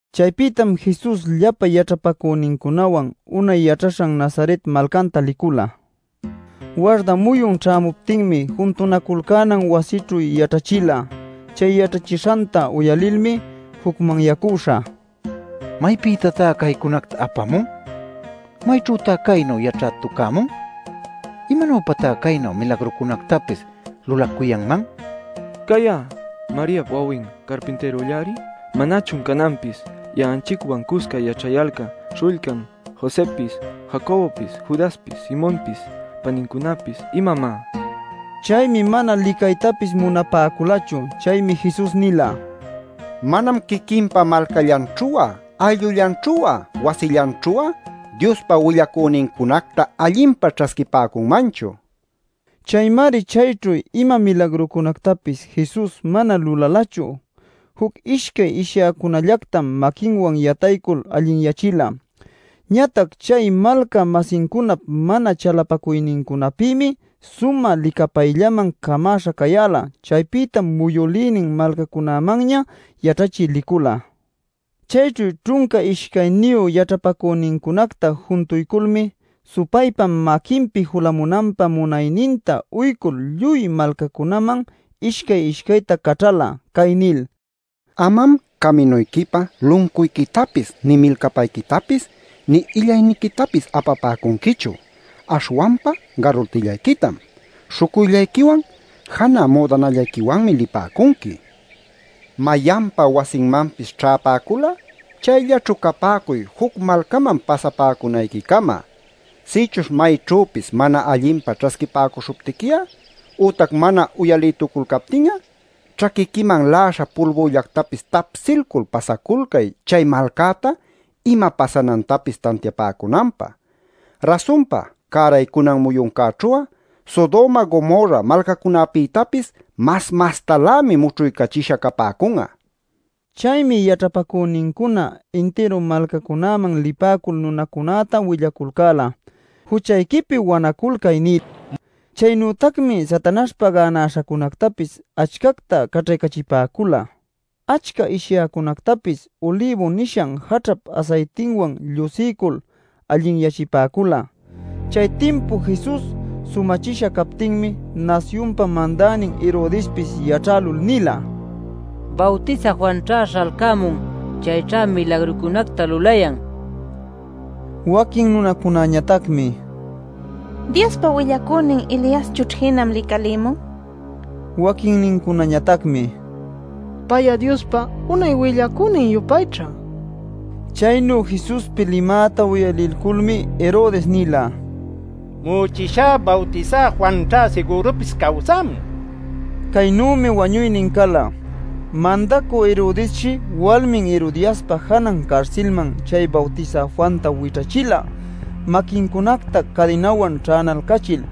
Chaypïtam Jesus llapa yaćhapacünincunawan unay yaćhaśhan Nazaret malcanta licula. Warda muyun ćhämuptinmi juntunaculcänan wasićhu yaćhachila. Chay yaćhachishanta uyalilmi jucmanyacüśha: “¿Maypïtatá caycunacta apämun? ¿Mayćhütá caynu yaćhätucämun? ¿Imanuypatá caynu milagrucunactapis lulacuyanman? Cay'a Mariap wawin carpintïrullari. ¿Manachun cananpis ya'anchicwan cusca yaćhayalcan śhullcan Josëpis, Jacobopis, Judaspis, Simonpis panincunapis, imamá?” nil nipäcula. Chaymi mana licaytapis munapäculachu. Chaymi Jesus nila: “Manam quiquinpa malcallanćhu'a ayllullanćhu'a wasillanćhu'a Diospa willacünincunacta allinpa ćhasquipäcunmanchu” nil. Chaymari chayćhu ima milagrucunactapis Jesus mana lulalachu; juc ishcay ishyäcunallactam maquinwan yataycul allinyachila. Ñatac chay malca-masincunap mana chalapacuynincunapïmi sumä licapayllaman camäśha cayäla. Chaypïtam muyülïnin malcancunamanña yaćhachï licula. Chayćhu ćhunca ishcayniyu yaćhapacünincunacta juntuyculmi supaypa maquinpi julamunanpä munayninta uycul lluy malcacunäman ishcay-ishcayta caćhala, cay nil: “Amam caminuyquipä luncuyquitapis, nï milcapayquitapis nï illayniquitapis apapäcunquichu, aśhwanpa garutillayquitam. Śhucuyllayquiwan janä müdanallayquiwanmi lipäcunqui. Mayanpa wasinmanpis ćhäpäcul'a chayllaćhu capäcuy juc malcaman pasapäcunayquicama. Sïchuśh mayćhüpis mana allinpa ćhasquipäcuśhuptiqui'a ütac mana uyalïtuculcaptin'a ćhaquiquiman la'aśha pulbüllactapis tapsilcul pasaculcay chay malcäta ima pasanantapis tantiapäcunanpä. ˻Rasunpa cäraycunan muyuncäćhu'a Sodoma Gomorra malcacunapïtapis mas mastalämi mućhuycachisha capäcun'a˼” nin. Chaymi yaćhapacünincuna intiru malcacunäman lipäcul nunacunäta willaculcäla: “Juchayquipi wanaculcay” nil. Chaynütacmi Satanaśhpa gänäśhacunactapis achcacta caćhaycachipäcula; achca ishyäcunactapis ulibu nishan jaćhap asaytinwan llusiycul allinyachipäcula. Chay timpu Jesus sumachisha captinmi nasyunpa mandänin Herodespis yaćhälul nila: “Bawtisä Juanćha śhalcämun; chayćha milagrucunacta lulayan” nil. Waquin nunacunañatacmi: “Diospa willacünin Eliaschućh jinam licalïmun” nipäcula. Waquinnincunañatacmi: “Pay'a Diospa unay willacünin-yupayćha” nipäcula. Caynu Jesuspi limäta uyalilculmi Herodes nila: “Mu'uchishá Bawtisä Juanćha sigürupis cawsämun” nil. Caynümi wañuynin cala: Mandacü Herodesshi walmin Herodiaspa janan carsilman chay Bawtisä Juanta wićhachila maquincunacta cadinawan ćhänalcachil.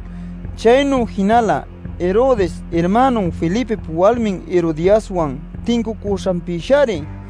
Chaynu jinala Herodes irmänun Felipip walmin Herodiaswan tincucüśhanpïshari.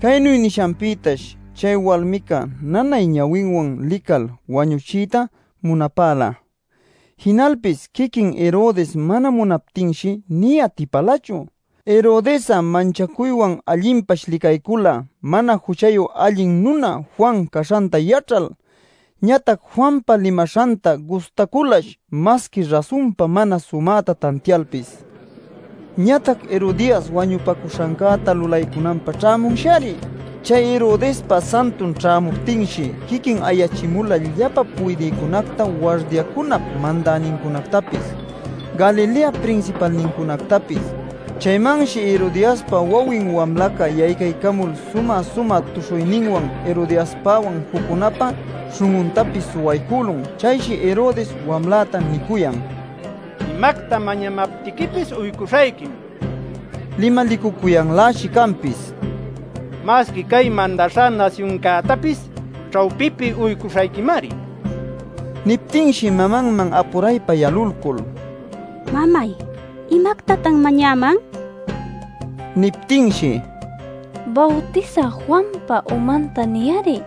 Caynu nishanpïtash chay walmica nanay ñawinwan lical wañuchiyta munapäla. Jinalpis quiquin Herodes mana munaptinshi nï atipälachu. Herodes'a manchacuywan allinpash licaycula mana juchayu allin nuna Juan caśhanta yaćhal. Ñatac Juanpa limaśhantá gustaculash masqui rasunpa mana sumäta tantialpis. Ñatac Herodias wañupacuśhancäta lulaycunanpä ćhämunshari. Chay Herodespa santun ćhämuptinshi quiquin ayachimula llapa puydïcunacta, wardiacunap mandänincunactapis, Galileap prinsipalnincunactapis. Chaymanshi Herodiaspa wawin wamlaca yaycaycamul sumä-sumä tuśhuyninwan Herodespawan juccunäpa śhun'untapis suwaycülun. Chayshi Herodes wamläta nicuyan: “Imacta mañamaptiquipis uycuśhayquim” nil. Limalicucuyanläshi canpis: “¡Masqui cay mandaśhá nasyuncätapis ćhawpipi uycuśhayquimari!” nil. Niptinshi mamanman apuraypa yalulcul: “Mamay, ¿imactatan mañäman?” nila. Niptinshi: “ ‘Bawtisä Juanpa umanta’ niy-ari” nila.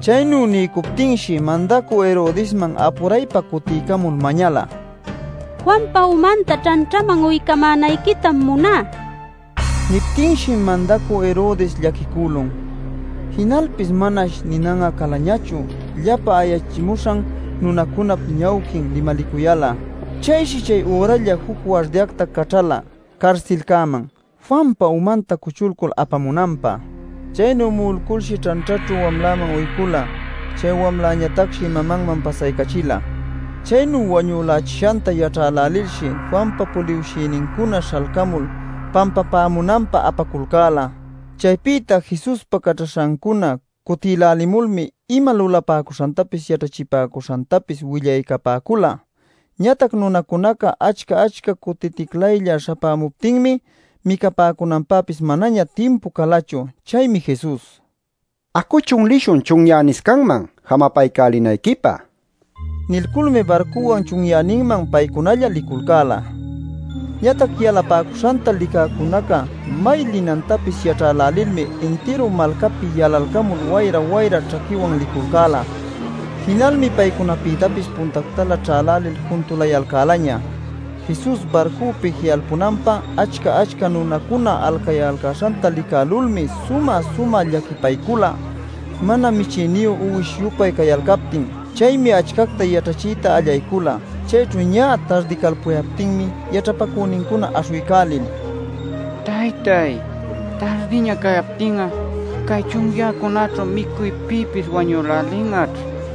Chaynu niycuptinshi mandacü Herodesman apuraypa cutiycamul mañala: “Juanpa umanta ćhanćhaman uycamänayquitam muná” nil. Niptinshi mandacü Herodes llaquicülun. Jinalpis manash ninan'a calañachu llapa ayachimuśhan nunacunap ñawquin limalicuyal'a. Chayshi chay üralla juc wardiacta caćhala carsilcäman Juanpa umanta cuchulcul apamunanpä. Chaynu mu'ulculshi ćhanćhaćhu wamläman uycula. Chay wamlañatacshi mamanman pasaycachila. Chaynu wañülächishanta yaćhälälilshi, Juanpa puliwshïnincuna śhalcämul pampapämunanpä apaculcäla. Chaypïta Jesuspa caćhaśhancuna cutïlälimulmi ima lulapäcuśhantapis yaćhachipäcuśhantapis willaycapäcula. Ñatac nunacunaca achca-achca cutiticlaylla śhapämuptinmi micapäcunanpäpis manaña timpu calachu. Chaymi Jesus: “Acuchun lishun chunyäniscanman, jamapaycälinayquipä” nin. Nilculmi barcuwan chunyäninman paycunalla liculcäla. Ñatac yalapäcuśhanta licäcunaca may linantapis yaćhälälilmi intiru malcapi yalalcamul wayra-wayra ćhaquiwan liculcäla. Jinalmi paycunapïtapis puntactalä ćhälälil juntulayalcälaña. Jesus barcupi ji'alpamunanpä achca-achca nunacuna alcayalcäśhanta licalculmi sumä-sumä llaquipaycula, mana michïniyu uwish-yupay cayalcaptin. Chaymi achcacta yaćhachiyta allaycula. Chayćhu ñä tardicalpuyaptinmi yaćhapacünincuna aśhuycälil: “Taytáy, tardiña cacuyaptin cay chunyäcäćhu micuypïpis wañülälin'aćh.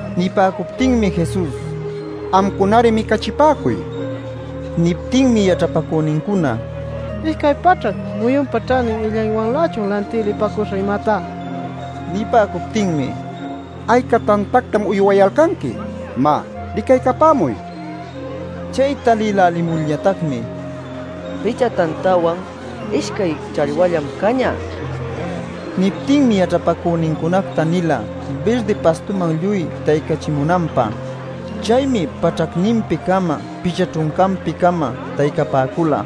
Nipäcuptinmi Jesus: “Amcunari micachipäcuy” nila. Niptinmi yaćhapacünincuna: “¿Ishcay paćhac muyunpa ćhanin illaywanlächun lantï lipäcuśhä imatá?” nila. Nipäcuptinmi: “¿Ayca tantactam uywayalcanqui? Má, licaycapämuy” nila. Chay talïlälimulñatacmi: “Picha tantawan ishcay challwallam cañä” nipäcula. Niptinmi yaćhapacünincunacta nila birdi pastuman lluy taycachipämunanpä. Chaymi paćhacninpi-cama, picha ćhuncanpi-cama taycapäcula.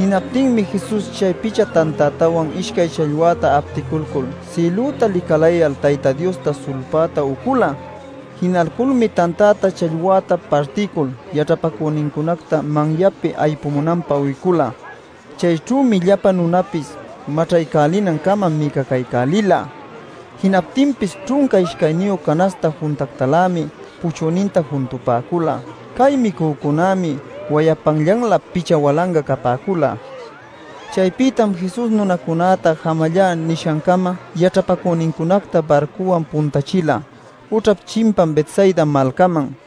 Jinaptinmi Jesus chay picha tantätawan ishcay challwäta apticulcul, sïlüta licalayal Tayta Diosta sulpayta ucula. Jinalculmi tantäta challwäta partilcul, yaćhapacünincunacta manyapi aypupämunanpä uycula. Chayćhümi llapa nunapis maćhaycälinancama micacaycälila. Jinaptinpis ćhunca ishcayniyu canaśhta juntactalämi puchüninta juntupäcula. Cay micücunämi wayapanllanlä picha walanga capäcula. Chaypïtam Jesus nunacunäta jamallá nishancama yaćhapacünincunacta barcuwan puntachila ućhap chimpan Betsaida malcaman.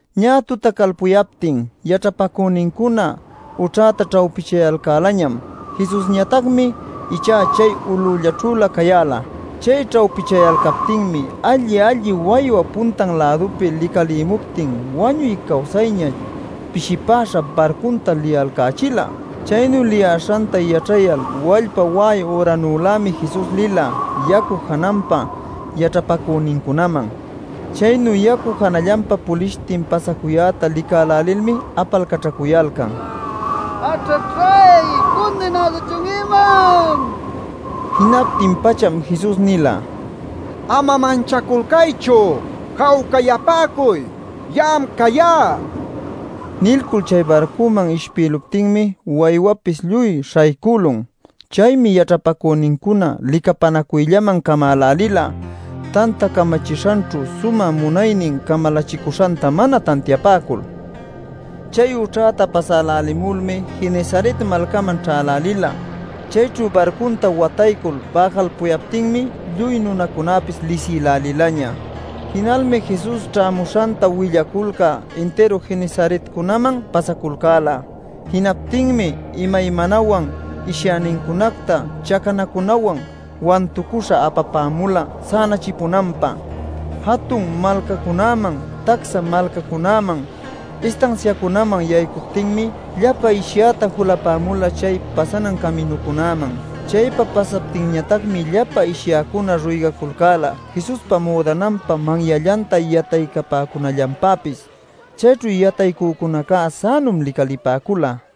Ñä tutacalpuyaptin yaćhapacünincuna ućhäta ćhawpichayalcälañam. Jesusñatacmi ichá chay ulullaćhülä cayäla. Chay ćhawpichayalcaptinmi alli-alli waywa punta-lädupi licalïmuptin wañuy cawsayña pishipäśha barcunta liyalcächila. Chaynu liyäśhanta yaćhayal wallpa wa'ay üranülämi Jesus lila yacu jananpa yaćhapacünincunaman. Chaynu yacu janallanpa pulishtin pasacuyäta licälälilmi apalcaćhacuyalcan: “¡Aćhaćhay! ¡¿Cundinäduchun imam?!” nil. Jinaptin-pacham Jesus nila: “¡Ama manchaculcaychu! ¡Jawcayapäcuy! ¡Ya'am cayá!” nil. Nilcul chay barcuman ishpïluptinmi waywapis lluy śhaycülun. Chaymi yaćhapacünincuna licapänacuyllaman camälälila tanta camachishanćhu sumä munaynin camalachicuśhanta mana tantiapäcul. Chay ućhäta pasälälimulmi Genesaret malcaman ćhälälila. Chayćhu barcunta wataycul bäjalpuyaptinmi lluy nunacunapis lisïlälilaña. Jinalmi Jesus ćhämuśhanta willaculcä intiru Genesaretcunaman pasaculcäla. Jinaptinmi imaymanawan ishyänincunacta chacanacunawan wantucuśha apapämula sänachipunanpä. Jatun malcacunaman, tacsa malcacunaman, istansiacunaman yaycuptinmi, llapa ishyäta julapämula chay pasanan caminucunäman. Chaypa pasaptinñatacmi llapa ishyäcuna ruygaculcäla Jesuspa müdananpa manyallanta yataycapäcunallanpäpis. Chayćhu yataycücunaca sänum licalipäcula.